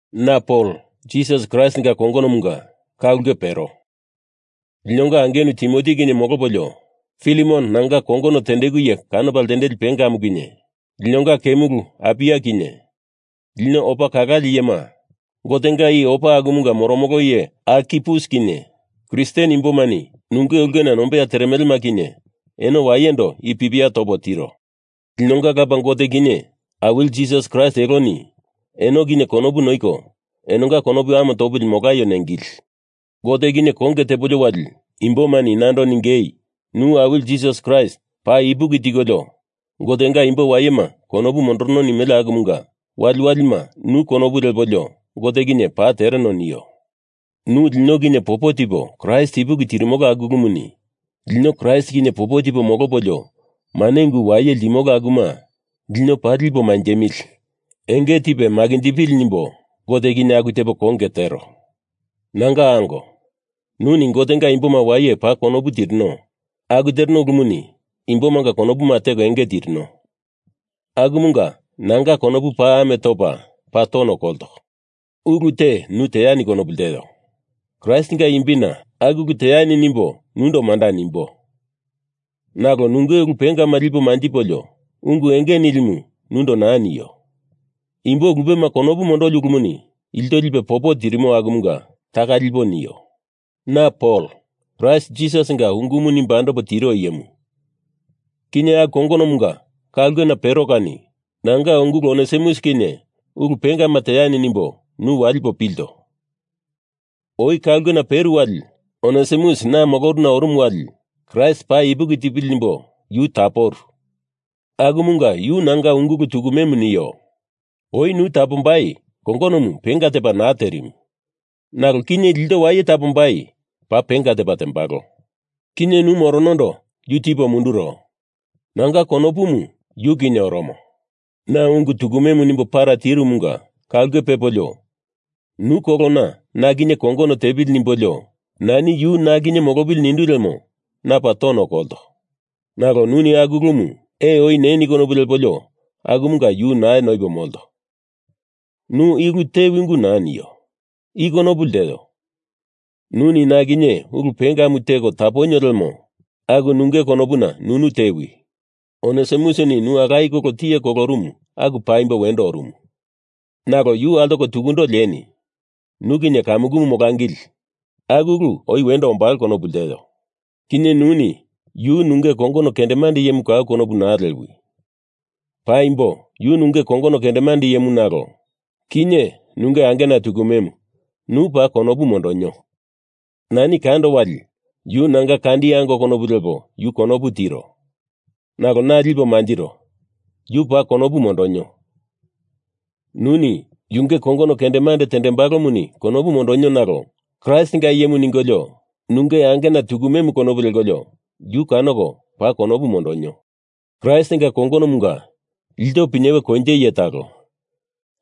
Na Pol, Jisas Kraistinga kongonomunga, ka ulke pero. Linonga angenu Timoti kinye molopolio Filemon, nanga kongono tendeku iye kanopa ltendeli pengamu kinye, linonga kemulu Apia kinye lino opa kalale iyema Gotenga i opa akumunga moromolo iye Arkipus kinye Kristen imbomani nunge ulkena nombeya teremelema kinye eno wayendo i pipia topo tiro. Linonga Lapa Gote kinye Awili Jisas Kraist eloni eno kinye konopu noiko enonga konopu ame topili molaio nengili. Gote kinye konge tepolio wali imbomani nando ningei nu Awili Jisas Kraist paa ipuki tikolio Gotenga imbo wayema konopu mondorono nimele akumunga wali walima nu konopu lepolio Gote kinye paa tereno nio. Nu lino kinye popo tipo Kraist ipuki tirimolo aku ulumuni lino Kraist kinye popo tipo molopolio mane ungu waye ltimolo akuma lino paa lipo manjemili enge tipe makinjipili nimbo Gote kinye aku tepo konge tero. Nanga ango, nuni Gotenga imboma waye paa konopu tirino aku tereno ulumuni imbomanga konopuma teko enge tirino. Akumunga nanga konopu paa ame topa paa tono kolto. Ulu te nu teani konopu lteo. Kraistinga imbina Aku ulumu teani nimbo nundo manda nimbo. Nalo nunge ulu pengama lipo manjipolio, ungu enge nilimu nundo naa nio. Imbo lupema konopu mondoli ulumuni ilto lipe popo tirimo akumunga taka lipo nio. Na Pol, Kraist Jisasinga ungumu nimbo andopo tiro iyemu, kinye aku kongonomunga ka ulkena pero kani nanga ungulu Onesimus kinye ulu pengama teani nimbo nu walipo pilto. Oi ka ulkena peru wali Onesimus na moloruna orumu wali Kraist paa ipuki tipili nimbo yu taporu. Akumunga yu nanga ungulu tukumemu nio. Oi nu tapombai kongonomu penga tepa naa terimu. Nalo kinye ilto waye tapombai paa penga tepa tembalo. Kinye nu moronondo yu tipo munduro. Nanga konopumu yu kinye oromo. Na ungu tukume nimbo para tirumunga ka ulke pepolio, nu kolona na kinye kongono tepili nimbolio nani yu na kinye molopili nindu lemo na paa tono kolto. Nalo nuni aku ulumu ee oi neni konopu lepolio akumunga yu naa noipo molto. Nu i ulu tewi ungu naa nio. I konopu lteo, nuni na kinye ulu pengamu teko taponio lemo aku nunge konopuna nunu tewi. Onesimusini nu alaye kolo tiye kolorumu aku paimbo wendo orumu. Nalo yu altoko tukundo lieni nu kinye kamukumu molangili aku ulu oi wendo ombalo konopu lteo. Kinye nuni yu nunge kongono kendemande iyemu kau konopu naa lewi. Paimbo, yu nunge kongono kendemande iyemu nalo kinye nunge angena tukumemu nu paa konopu mondonio. Nani kando wali yu nanga kandi ango konopu lepo yu konopu tiro. Nalo na lipo manjiro, yu paa konopu mondonio. Nuni yunge kongono kendemande tembalomuni konopu mondonio nalo Kraistinga iyemu ningolio nunge angena tukumemu konopu lekolio yu kanoko paa konopu mondonio. Kraistinga kongonomunga ilto pinyewe koinje iye talo,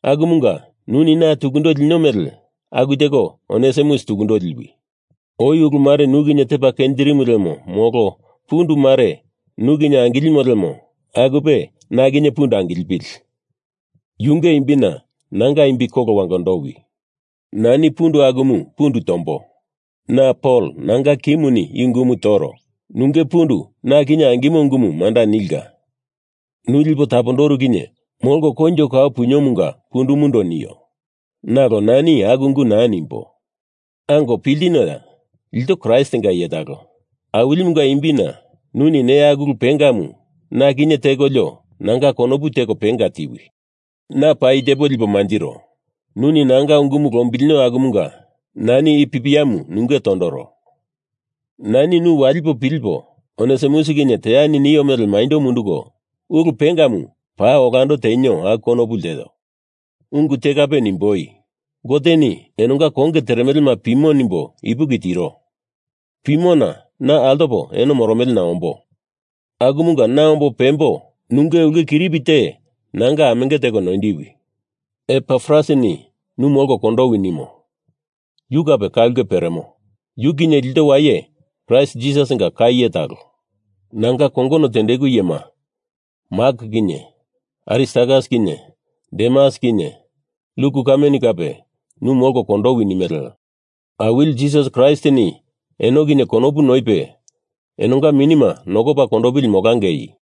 akumunga nuni na tukundo linio mele aku teko Onesimus tukundo liwi. Oi ulumare nu kinye tepa kenjirimu lemo molo pundu mare nu kinye angilimo lemo akupe na kinye pundu angilipili yunge imbina nanga imbi kolo wangondowi. Nani pundu akumu pundu tombo. Na Pol nanga kimuni i ungumu toro. Nunge pundu na kinye angimo ungumu manda nilka. Nu lipo tapondoru kinye molko koinjo kau puniomunga pundumundo nio. Nalo nani aku ungu naa nimbo. Ango, piltinoya. Ilto Kraistinga iye talo. Awilimunga imbina nuni neya aku ulu pengamu na kinye tekolio nanga konopu teko penga tiwi. Na paa i tepo lipo manjiro, nuni nanga ungumu lombilinio akumunga nani i pipiamu nunge tondoro. Nani nu walipo pilipo Onesimus kinye teani nio mele maindo munduko ulu pengamu paa olando tenio aku konopu lteo. Ungu te kape nimboi. Goteni enonga konge teremelema pimo nimbo ipuki tiro. Pimona na altopa eno moromelena ombo. Akumunga na ombo pembo nunge ulke kiripi te nanga amenge teko noindiwi. Epafrasini nu molko kondowi nimo. Yu kape ka ulke peremo. Yu kinye ilto waye Kraist Jisasinga ka iye talo. Nanga kongono tendeku iyema, Mak kinye Aristarkas kinye Demas kinye Luk kameni kape nu molko kondowi nimele. Awili Jisas Kraistini eno kinye konopu noipe enonga minima nokopa kondopili molangei.